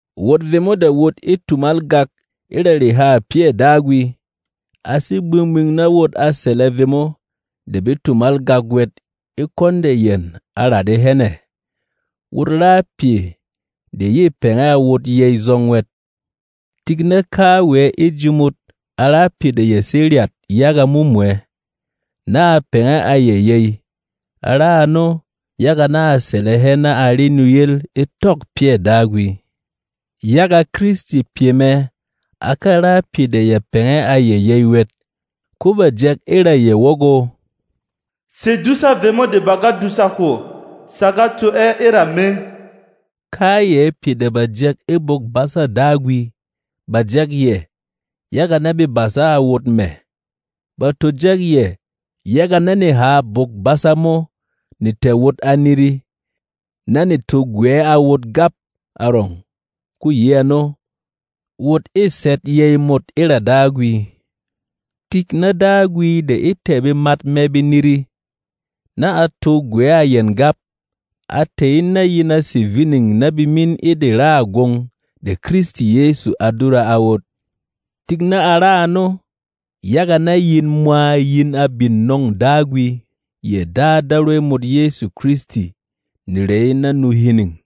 Wot vemo de wot e tumal gak e ra rehâ pyɛ̂ Dagwi, a sé gbing-gbing na wot a sɛlɛ vemo de be tumal gak wɛt e kwɔn de yɛn a radɛ hɛn ɛ̀. Wot ra pyɛ de yê pɛngɛ a wot yey zɔng wɛt. Tik na kawɛ e ji mot a ra pyɛ de ya sé ryat yaga mumwɛ, na a pɛngɛ a yɛ yey. A ra ano, yaga na a sɛlɛ hɛ na a re nuyel e tɔ̂k pyɛ̂ Dagwi. Yaga Kristi pyɛ mɛ a ka ra pyɛ de ya pɛngɛ a yɛ yey wɛt. Ko bà jɛk e ra yɛ wɔgɔ, “Sedusâ vemo de ba ga dùsa hwo sa ga to ɛ e ra me.” Kayɛ pyɛ de bà jɛk e Bwok-basa Dagwi, bà jɛk yɛ, yaga na be basa a wot mɛ̀. Ba to jɛk yɛ, yaga na neha Bwok-basa mo ne tɛ̀ wot a niri, na ne to gwɛ̌ a wot gap arɔng. Ko yi ano, wot ê sɛt yey mot e ra Dagwi. Tik na Dagwi de e tɛ̀ bemat mɛ be niri, na a to gwɛ̌ a yɛn gap, a tɛ̀ in na yin a sè vining na bemín e de raà gwong de Kristi Yɛsu a dura a wot. Tik na a ra ano, yaga na yin mwa yin a bin nɔ̂ng Dagwi, yɛ Dâ Darwey mot Yɛsu Kristi, nerey na nu hining.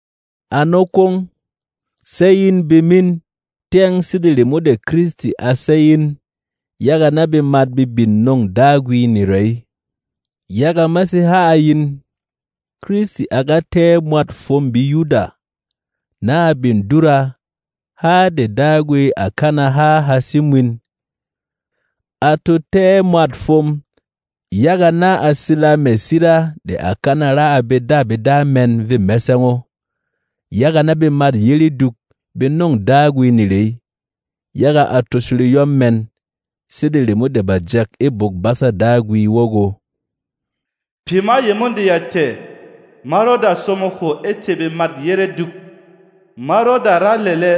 Ano kwong, séy in bemín, tyɛng sede remo de Kristi a sey in, yaga na bemat be bin nɔ̂ng Dagwi nerey. Yaga ma sé ha a yin, Kristi a ga tɛ́ ɛ mwât fwom BeYuda, na a bin dura, há de Dagwi à kana ha ha sé mwin. A to tɛ́ ɛ mwât fwom, yaga na a sila mɛ̀ sira de à kana ra a bedabeda mɛn vê mɛsɛng o, yaga na bemât yére dyuk be nɔ̂ng Dagwi nerey, yaga a tosho reyɔm mɛn. Sede remo de bà jɛk e Bwok-basa Dagwi wɔgɔ, “Pyɛ ma yemo de ya tɛ̀, ma rɔda somo hwo e tê bemât yére dyuk; ma rɔda ra lɛlɛ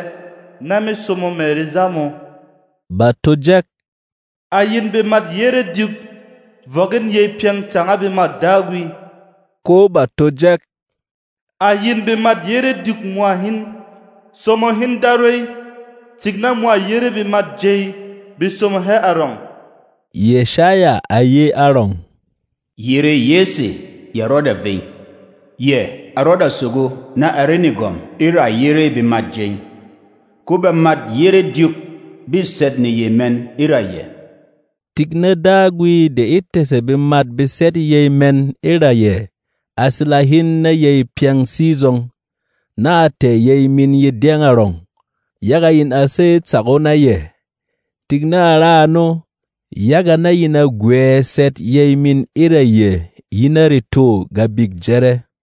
na me somo mɛ̀ reza mō.” Bà to jɛk, “À yin bemât yére dyuk, vɔk in yey pyɛng tanga bemât Dagwi!” Ko bà to jɛk, “À yin bemât yére dyuk mwa hin, somo hin Darwey! Tik na mwa yére bemat jey be somo hɛ arɔng!” Yɛshaya à ye arɔng, “Yerê Yɛsɛ ya rɔda vey, yɛ a rɔda sogo na a re negwɔm e ra yére bemat jey. Ko bemât yére dyuk bê sɛt yey mɛn e ra yɛ.” Tik na Dagwi de e tɛ̀sɛ bemat be sɛt yey mɛn e ra yɛ a sila hin na yey pyɛng sizɔng, na a tɛ̀ yey min ye dyɛng arɔng, yaga yin a sey tsak o na yɛ. Tik na a ra ano, yaga na yin a gwɛ̌ sɛt yey min e ra yɛ yi na retô Gabik Jɛrɛ.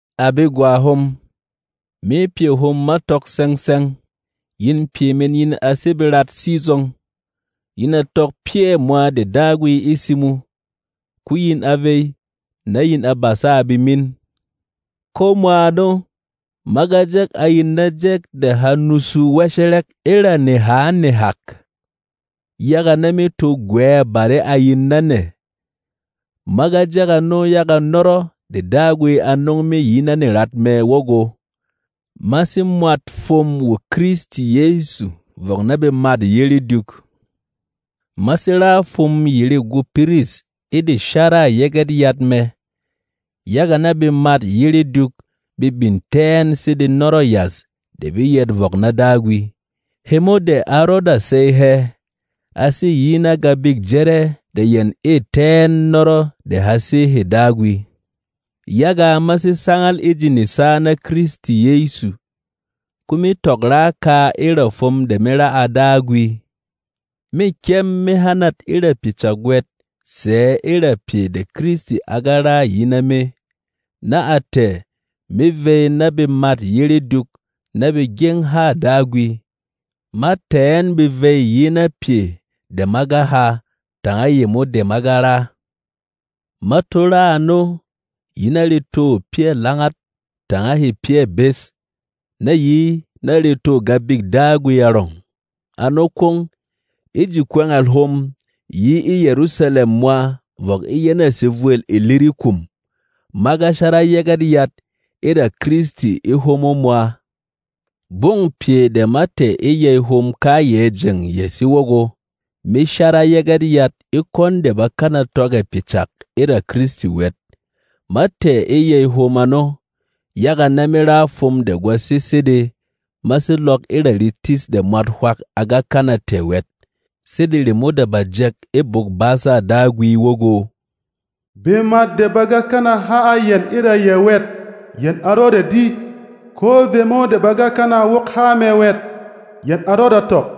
À begwa hom, me pyɛ hom ma tɔk tsɛng-tsɛng, yin pyɛ min yin a sé berat sizɔng. Yin a tɔk pyɛ̂ mwa de Dagwi e simo, ko yin a vey, na yin a basa a bemin. Ko mwa ano, ma ga jɛk a yin na jɛk de ha nusu wɛshɛrɛk e ra neha nehak, yaga na me to gwɛ̌ bare a yin na nɛ. Ma ga jɛk ano yaga nɔrɔ de Dagwi a nɔng me yi na nerat mɛ wɔgɔ, ma sé mwât fwom wo Kristi Yɛsu vɔk na bemât yére dyuk. Ma sé ra fwom yere gwô piris e de sharâ Yɛgɛt Yat mɛ, yaga na bemât yére dyuk be bin tɛ́ ɛn sede nɔrɔ̂ yas de be yɛt vɔk na Dagwi, hemo de a rɔda sey hɛ. A sé yi na Gabik Jɛrɛ de yɛn ê tɛ́ ɛn nɔrɔ de ha sé hê Dagwi. Yaga ma sé sangal e ji nesa na Kristi Yɛsu, ko me tɔk ra kaa e ra fwom de me ra a Dagwi. Mê kyɛm me hanat e ra pyɛ cak wɛt sɛ̌ e rà pyɛ de Kristi a ga ra yi na me, na a tɛ̀, me vey na bemât yére dyuk na be gyeng hâ Dagwi. Ma tɛ̀ ɛn be vey yi na pyɛ de ma ga ha tanga yemo de ma ga ra. Ma to ra ano yi na retô pyɛ̂ langat tanga hê pyɛ̂ bes, na yi na retô Gabik Dagwi arɔng. Ano kwong, e ji kwɛngɛl hom yi e Yɛrusalɛm mwa vɔk e yɛnɛ̂ sevwêl Ilirikum, ma ga shara Yɛgɛt Yat e ra Kristi e hwomo mwa. Gbɔng pyɛ de ma tɛ̀ e yey hom kayɛ jeng ya sé wɔgɔ, me shara Yɛgɛt Yat e kwɔn de bá kana tɔk ɛ̀ pyɛ cak e ra Kristi wɛt. Ma tɛ̀ e yey hom ano, yaga na me ra fwom de gwa sé sede ma sé lɔk e ra retis de mwat hwak a ga kana tɛ̀ wɛt. Sede remo de bà jɛk e Bwok-basa Dagwi wɔgɔ, “Bemat de ba ga kana ha a yɛn e ra yɛ wɛt, yɛn a rɔda di; ko vemo de ba ga kana wok há mɛ wɛt, yɛn a rɔda tɔk.”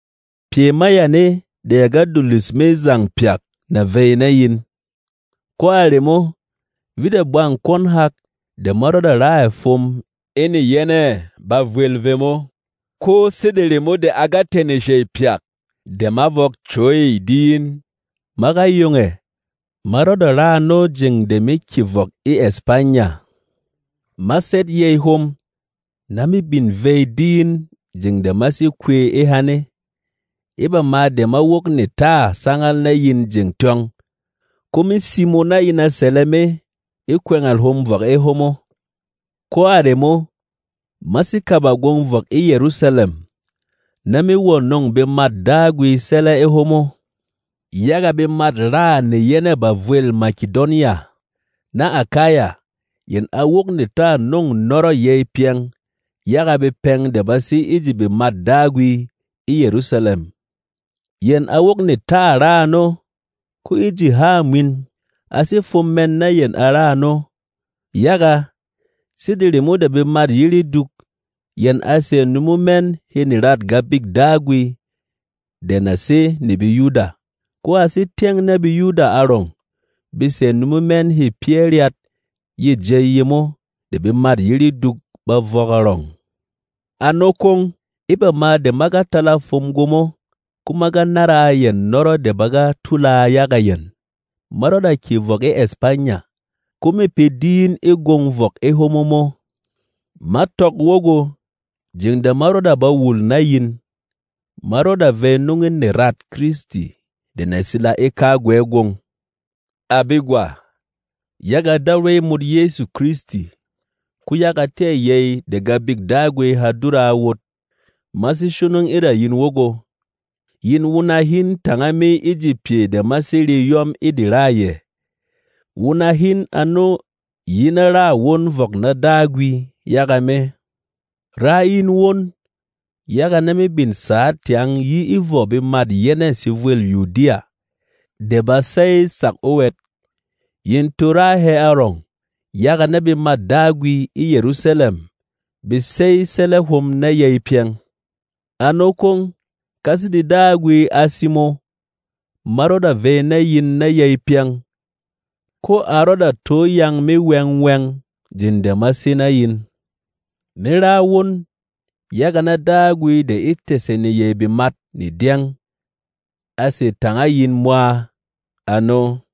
Pyɛ ma yane de ya ga dulus me zang pyak nà vey na yin. Ko a remo, vit a bwang kwɔn hak de ma rɔda ra ɛ̀ fwom e neyɛnɛ̂ bavwel vemo. Ko sede remo de a ga tɛ̀ neshey pyak de ma vɔk cwey di in, ma ga yong ɛ̀, ma rɔda ra ano jeng de me kyè vɔk e Ɛspanya Ɛspanya: wɔgɔ: Spain e lêm BeLasara.. Ma sɛt yey hom, na me bin vey di in jeng de ma sé kwey e hane. E bama de ma wok netâ sangal na yin jeng tyɔng, ko me simo na yin a sɛlɛ me e kwɛngɛl hom vɔk e hwomo. Ko a remo, ma sé kaba gwong vɔk e Yɛrusalɛm na me wɔ̀ nɔ̂ng bemât Dagwi sɛlɛ e hwomo. Yaga bemat-raà neyɛnɛ̂ bavwêl Makedonya na Akaya yɛn a wok netâ nɔ̂ng nɔrɔ̂ yey pyɛng yaga bepɛng de ba sé e ji bemât Dagwi e Yɛrusalɛm. Yɛn a wok netâ ra ano, ko e ji hâ mwin, a sé fwom mɛn na yɛn a ra ano. Yaga, sede remo de bemât yére dyuk yɛn a sɛ̀ numo mɛn hê nerât Gabik Dagwi de na sé ne BeYuda, ko a sé tyɛng na BeYuda arɔng be sɛ̀ numo mɛn hê pyɛ́ ryat yê jey yemo de bemât yére dyuk ba vɔk arɔng. Ano kwong, e bama de ma ga tala fwom gwomo, ko ma ga nára a yɛn nɔrɔ de ba ga tula yaga yɛn, ma rɔda kyè vɔk e Ɛspanya, ko mê pe di in e gwong vɔk e hwomo mo. Ma tɔk wɔgɔ, jeng de ma rɔda ba wul na yin, ma rɔda vey nɔng in nerât Kristi de na sila e kagwɛ gwong. À begwa, yaga Darwey mot Yɛsu Kristi, ko yaga tɛ̂ yey de Gabik Dagwi ha dura a wot, ma sé shonong e ra yin wɔgɔ, yin wuna hin tanga me e ji pyɛ de ma sé re yɔ́m e de râ yɛ. Wuna hin ano yi na râ won vɔk na Dagwi yaga me. Rá in won, yaga na me bin sǎ tyang yi e vɔ bemât yɛnɛ̂ sevwêl Yudiya de ba sey tsak o wɛt. Yin to ra hɛ arɔng, yaga na bemât Dagwi e Yɛrusalɛm be sey sɛlɛ hom na yey pyɛng. Ano kwong, ka sede Dagwi a simo, ma rɔda vey na yin na yey pyɛng, ko a rɔda to yang me wɛng-wɛng jeng de ma sé na yin. Me ra won, yaga na Dagwi de e tɛ̀sɛ neyey bemat ne dyɛng a sè tanga yin mwa. Ano.